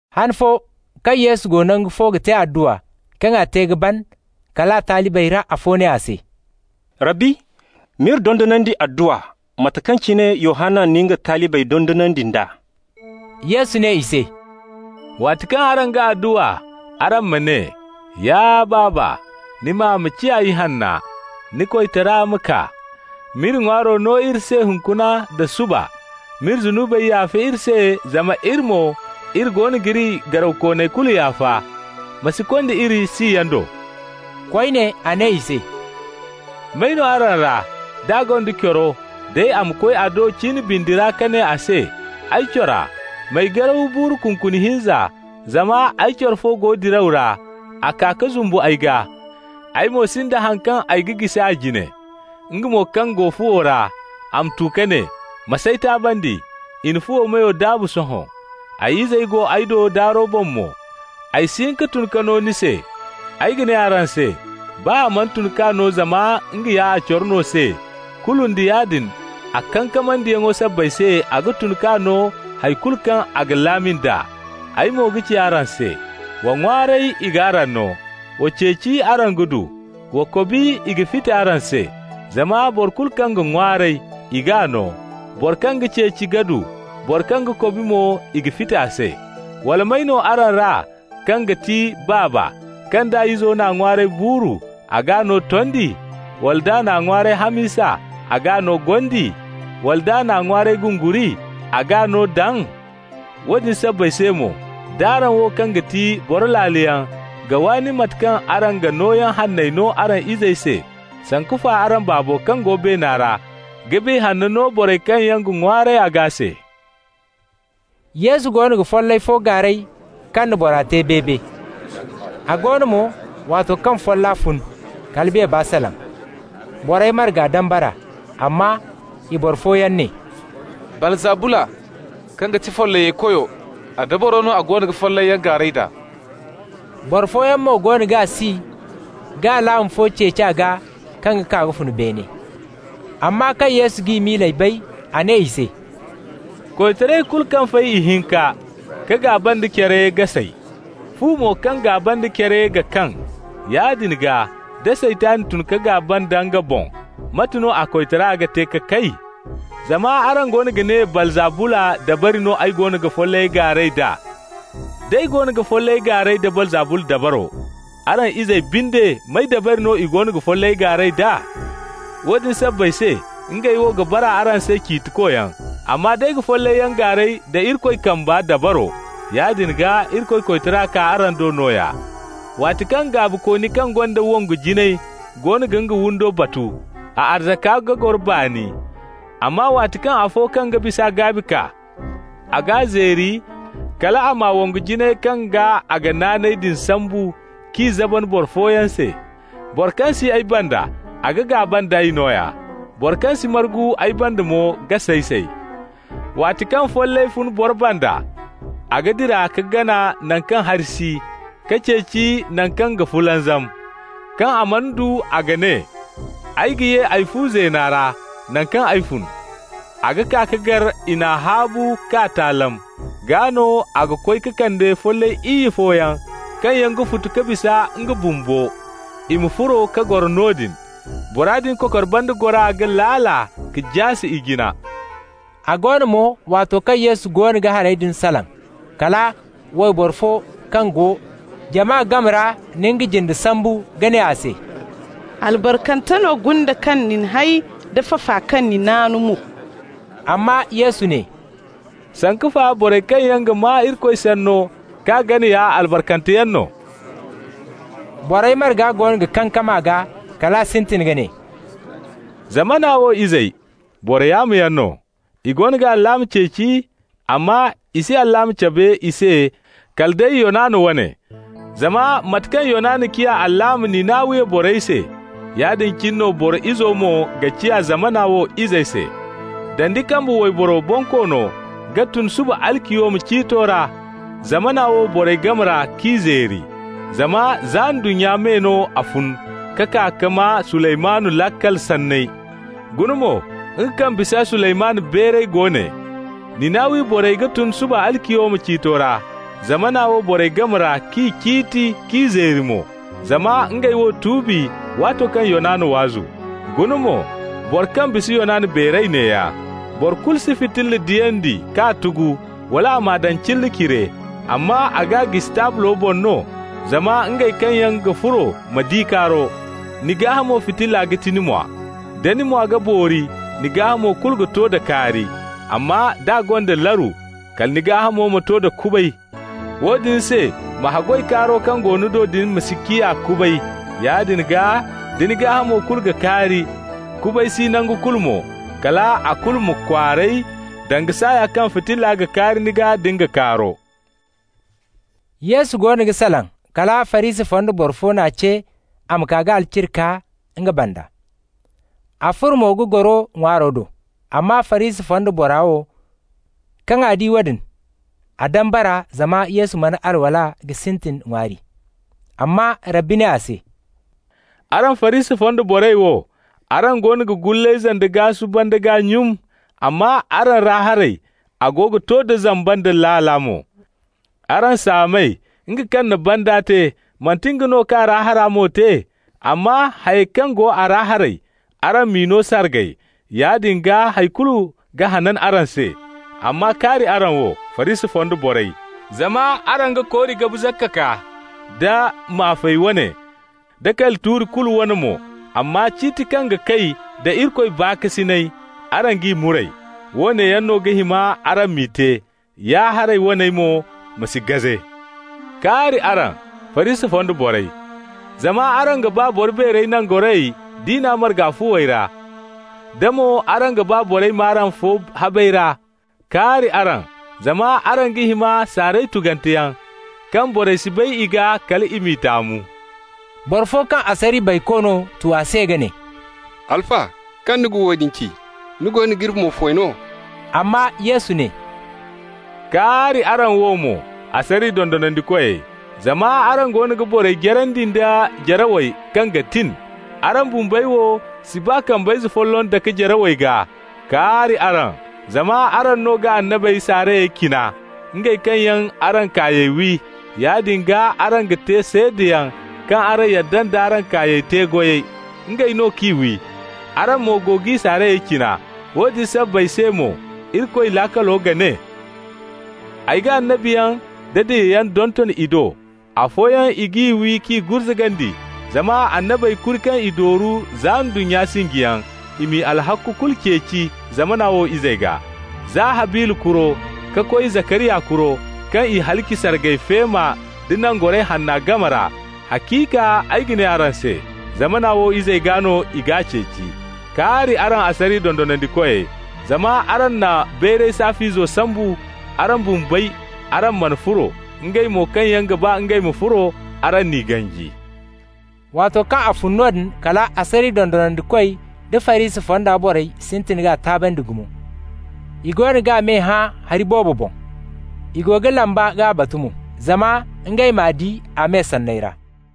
Han fo, kaŋ Yesu go nangu fo ga te adduwa, kaŋ a te ka ban, kal a talibey ra afo ne a se: «Rabbi, m'iri dondonandi adduwa, mate kaŋ cine Yohanna na nga talibey dondonandi nd'a.» Yesu ne i se: «Waati kaŋ araŋ ga adduwa, araŋ ma ne: ‹Ya Baaba, ni maa ma ciya ihanna. Ni koytara ma kaa. M'iri ŋwaaro no iri se hunkuna nda suba. M'iri zunubey yaafa iri se, zama iri mo, iri goono g'iri garawkooney kulu yaafa. Ma si konda iri siyaŋ do.›» Koyne a ne i se: «May no araŋ ra, d'a gonda coro, day a ma koy a do cin bindi ra ka ne a se: ‹Ay cora, m'ay garaw buuru kunkuni hinza, zama ay coro fo go diraw ra, a kaa ka zumbu ay gaa. Ay mo sinda haŋ kaŋ ay ga jisi a jine.› Nga mo kaŋ go fuwo ra, a ma tu ka ne: ‹Ma s'ay taabandi. I na fu meyo daabu sohõ. Ay izey go ay do daaro boŋ mo. Ay si hin ka tun ka no ni se.› Ay ga ne araŋ se: baa a mana tun k'a no zama nga ya a coro no se, kulu nda yaadin a kankamandiyaŋo sabbay se a ga tun k'a no hay kulu kaŋ a ga laami nd'a. Ay mo ga ci araŋ se: wa ŋwaaray, i g'araŋ no. Wa ceeci, araŋ ga du. Wa kobi, i ga fiti araŋ se. Zama boro kulu kaŋ ga ŋwaaray, i g'a no, boro kaŋ ga ceeci ga du, boro kaŋ ga kobi mo, i ga fiti a se. Wala may no araŋ ra kaŋ ga ti baaba, kaŋ d'a izo n'a ŋwaaray buuru, a g'a no tondi? Wala d'a n'a ŋwaaray hamisa, a g'a no gondi? Wala d'a n'a ŋwaaray gunguri, a g'a no daŋ? Woodin sabbay se mo, d'araŋ wo, kaŋ ga ti boro laaloyaŋ ga waani mate kaŋ araŋ ga nooyaŋ hanney no araŋ izey se, sanku fa araŋ Baabo kaŋ go beena ra ga Biya Hanna no borey kaŋ yaŋ ga ŋwaaray a gaa se.» Yesu goono ga follay fo gaaray kaŋ na bora te beebe. A go no mo, waato kaŋ folla fun, kala beeba salaŋ. Borey marga dambara. Amma i boro fooyaŋ ne: «Baalzabula kaŋ ga ti follayey koyo, a dabaro no a goono ga follayyaŋ gaaray d'a.» Boro fooyaŋ mo goono g'a si, ka alaama fo ceeci a gaa kaŋ ga kaa ka fun beene. Amma kaŋ Yesu g'i miiley bay, a ne i se: «Koytaray kulu kaŋ fay ihinka ka gaaba nda care ga say. Fu mo kaŋ gaaba nda care ga kaŋ. Yaadin gaa, da Saytan tun ka gaaba nda nga boŋ, mate no a koytara ga te ka kay? Zama araŋ goono ga ne Baalzabula dabari no ay goono ga follayey gaaray d'a. D'ay goono ga follayey gaaray da Baalzabula dabaro, araŋ izey binde, may dabari no i goono ga follayey gaaray d'a? Woodin sabbay se, ngey wo ga bara araŋ se ciitikoyaŋ. Amma d'ay ga follayyaŋ gaaray da Irikoy kamba dabaro, yaadin gaa Irikoy koytara kaa araŋ do nooya. Waati kaŋ gaabikooni kaŋ gonda wongu jinay goono ga nga windo batu, a arzaka ga goro baani. Amma waati kaŋ afo kaŋ bis'a gaabi kaa, a g'a zeeri, kal a m'a wongu jinayey kaŋ gaa a ga naanay din sambu, k'i zaban boro fooyaŋ se. Boro kaŋ si ay banda, a ga gaaba nd'ay nooya. Boro kaŋ si margu ay banda mo ga say-say. Waati kaŋ follay fun boro banda, a ga dira ka gana naŋ kaŋ hari si, ka ceeci naŋ kaŋ ga fulanzam. Kaŋ a mana du, a ga ne: ‹Ay ga ye ay fu zeena ra, naŋ kaŋ ay fun.› A ga kaa ka gar i n'a haabu k'a taalam. Gaa no a ga koy ka kande follay iyye fooyaŋ kaŋ yaŋ ga futu ka bisa nga bumbo, i ma furo ka goro noodin. Bora din kokor banda gora ga laala ka jaase ijina.» A go no mo, waato kaŋ Yesu goono ga hayey din salaŋ, kala wayboro fo kaŋ go jama game ra na nga jinde sambu ka ne a se: «Albarkante no gunde kaŋ na ni hay da fafa kaŋ ni naanu mo.» Amma Yesu ne: «Sanku fa borey kaŋ yaŋ ga maa Irikoy Sanno k'a gana ya albarkante yaŋ no.» Borey marga goono ga kankam a gaa, kal a sintin ka ne: «Zamana wo izey, boro yaamoyaŋ no. I goono ga alaama ceeci, amma i si alaama cabe i se kala day Yonana wane. Zama mate kaŋ Yonana ciya alaama Ninawiya borey se, yaadin cine no Boro Izo mo ga ciya zamana wo izey se. Dandi kambe wayboro bonkoono ga tun suba-aliciyoma ciito ra zamana wo borey game ra k'i zeeri. Zama za ndunnya me no a fun ka kaa ka maa Suleymanu laakal sanney. Guna mo, nga kaŋ bisa Suleymanu beeray go ne. Ninawiya borey ga tun suba-aliciyoma ciito ra zamana wo borey game ra k'i ciiti k'i zeeri mo, zama ngey wo tuubi waato kaŋ Yonana waazu. Guna mo, boro kaŋ bisa Yonana beeray neeya. Boro kulu si fitilla diyandi k'a tugu, wala a m'a daŋ cilla cire. Amma a g'a jisi taablo boŋ no, zama ngey kaŋ yaŋ ga furo ma di kaaro. Ni gaahamo fitilla ga ti ni mwa. Da ni mwa ga boori, ni gaahamo kulu ga to da kaari. Amma d'a gonda laru, kala ni gaahamo ma to da kubay. Woodin se ma haggoy kaaro kaŋ go ni do din ma si ciya kubay. Yaadin gaa da ni gaahamo kulu ga kaari, kubay si nangu kulu mo, kal a kulu ma kwaaray danga saaya kaŋ fitilla ga kaari ni gaa da nga kaaro.» Yesu goono ga salaŋ, kala Farisi fonda boro fo n'a ce a ma kaa ka alciri kaa nga banda. A furo mo ka goro ŋwaaro do. Amma Farisi fonda bora wo, kaŋ a di woodin, a dambara zama Yesu mana alwala ka sintin ŋwaari. Amma Rabbi ne a se: «Araŋ Farisi fonda borey wo, araŋ goono ga gullayze da gaasu banda gaa nyun, amma araŋ ra haray, a ga to da zamba nda laala mo. Araŋ saamey! Nga kaŋ na banda te, manti nga no ka a ra hara mo te? Amma hayey kaŋ go a ra haray, araŋ m'i no sargay. Yaadin gaa hay kulu ga hanan araŋ se. Amma kaari araŋ wo, Farisi fonda borey! Zama araŋ ga kori gabu zakka kaa, da maafay wane, da kali tuuri kulu wane mo, amma ciiti kaŋ ga kay da Irikoy baakasinay, araŋ g'i muray. Woone yaŋ no ga hima araŋ m'i te, ya-haray waney mo ma si gaze. Kaari araŋ, Farisi fonda borey! Zama araŋ ga ba boro beerey nangorayey diina marga fuwey ra, da mo araŋ ga ba borey m'araŋ fo habey ra. Kaari araŋ! zama araŋ ga hima saaray tugante yaŋ, kaŋ borey si bay i gaa, kal i m'i taamu.» Boro fo kaŋ asariya bayko no tu a se ka ne: «Alfa, kaŋ ni na woodin ci, ni goono g'iri mo foy no.» Amma Yesu ne: «Kaari araŋ wo mo, asariya dondonandikoy! Zama araŋ goono ga borey jarandi nda jarawey kaŋ ga tin. Araŋ bumbey wo si baa kambayze folloŋ dake jarawey gaa. Kaari araŋ! Zama araŋ no ga annabey saarayey cina, ngey kaŋ yaŋ araŋ kaayey wi. Yaadin gaa araŋ ga te seedayaŋ kaŋ araŋ yadda nd'araŋ kaayey te-goyey. Ngey no k'i wi, araŋ mo go g'i saarayey cina. Woodin sabbay se mo, Irikoy laakalo ga ne: ‹Ay ga annabiyaŋ da diyayaŋ donton i do. Afooyaŋ, i g'i wi k'i gurzugandi,› zama annabey kuri kaŋ i dooru za ndunnya sinjiyaŋ, i m'i alhakku kulu ceeci zamana wo izey gaa, za Habila kuro ka koy Zakariya kuro, kaŋ i halaci sargay feema da Nangoray Hanna game ra. Haciika, ay ga ne araŋ se: zamana wo izey gaa no i g'a ceeci. Kaari araŋ asariya dondonandikoy! Zama araŋ na bayray saaf'izo sambu. Araŋ bumbey, araŋ mana furo, ngey mo kaŋ yaŋ ga ba ngey ma furo, araŋ n'i ganji.» Waato kaŋ a fun noodin, kala asariya dondonandikoy da Farisi fonda borey sintin k'a taabandi gumo. I goono g'a me hã hari boobo boŋ. I go ga lamba k'a batu mo, zama ngey m'a di a me sanney ra.